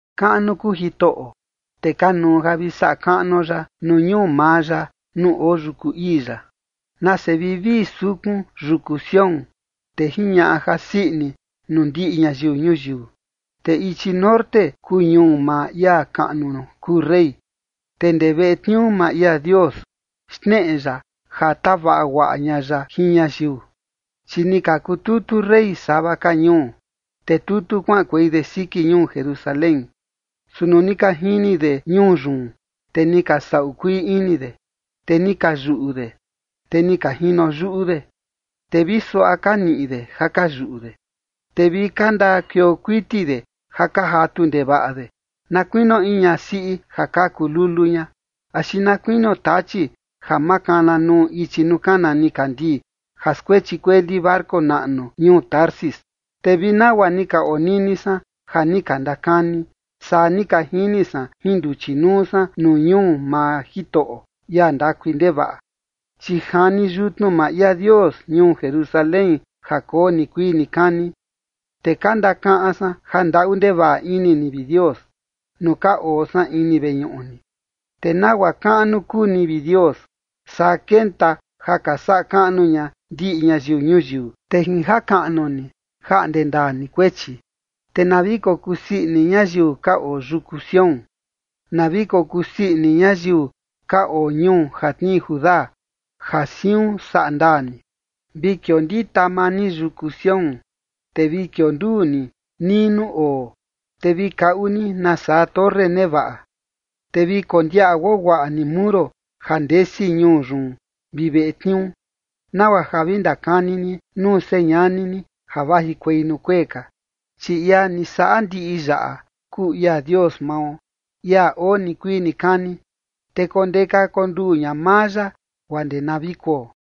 Kaꞌnu kuu Jitoꞌo, te kanuu ja vi saꞌa kaꞌnuo ya nuu ñuu maa ya nuu oo yuku ii ya. Nase vivii sukun yuku Sión, te jiñaꞌa jasii ini nuu ndiꞌi ñayiu ñuyiu, te ichi norte kuu ñuu maa ia kaꞌnu kuu rey. Te ndee veꞌe tniuu maa ia Dios, xneꞌe ya ja tavaꞌa guaꞌa ña ya jin ñayiu. Chi ni ka kututu rey sava ka ñuu, te tutu kuaꞌankuei de siki ñuu Jerusalén. Su nuu ni ka jini de ñuu yun, te ni ka saꞌu kuii ini de, te ni ka yuꞌu de, te ni ka jino yuꞌu de. Te vi suaꞌa ka niꞌi de ja ka yuꞌu de, te vi ka ndakuioo kuiti de ja ka jatu ndevaꞌa de, na kuinio in ñasiꞌi ja kaku lulu ña, axi na kuinio tachi ja makana nuu ichi nuu kana nikandii ja skuechi kueli barco naꞌnu ñuu Tarsis. Te vi nagua ni ka onini san ja ni ka ndakani, saa ni ka jini san jin nduchi nuu san nuu ñuu maa Jitoꞌo, ia ndakui ndevaꞌa, chi jani yutnu maa ia Dios ñuu Jerusalén ja koo nikuii nikani. Te ka ndakaꞌan san ja ndaꞌu ndevaꞌa ini ni, vi Dios, nuu ka oo san ini veñuꞌu ni. Te nagua kaꞌnu kuu ni, vi Dios, saa kenta ja ka saꞌa kaꞌnu ña ndiꞌi ñayiu ñuyiu, te jin jakaꞌnu ni, jaꞌnde ndaa ni kuechi. Te na vi kokusii ini ñayiu ka oo yuku Sión, na vi kosii ini ñayiu ka oo ñuu ja tnii Judá, ja siun saꞌa ndaa ni. Vi kiondita maa ni yuku Sión, te vi kionduu ni nii nuu oo, te vi kaꞌu ni nasaa torre nevaꞌa, te vi kondiaꞌa guaguaꞌa ni muro ja ndesi ñuu yun vi veꞌe tniuu, nagua ja vi ndakani ni nuu señani ni ja vajikuei nuu kuee ka. Chi ia ni saꞌa ndiꞌi yaꞌa kuu ia Dios mao, ia oo nikuii nikani, te kondeka konduu ña maa ya guaa ndee na vi kuo.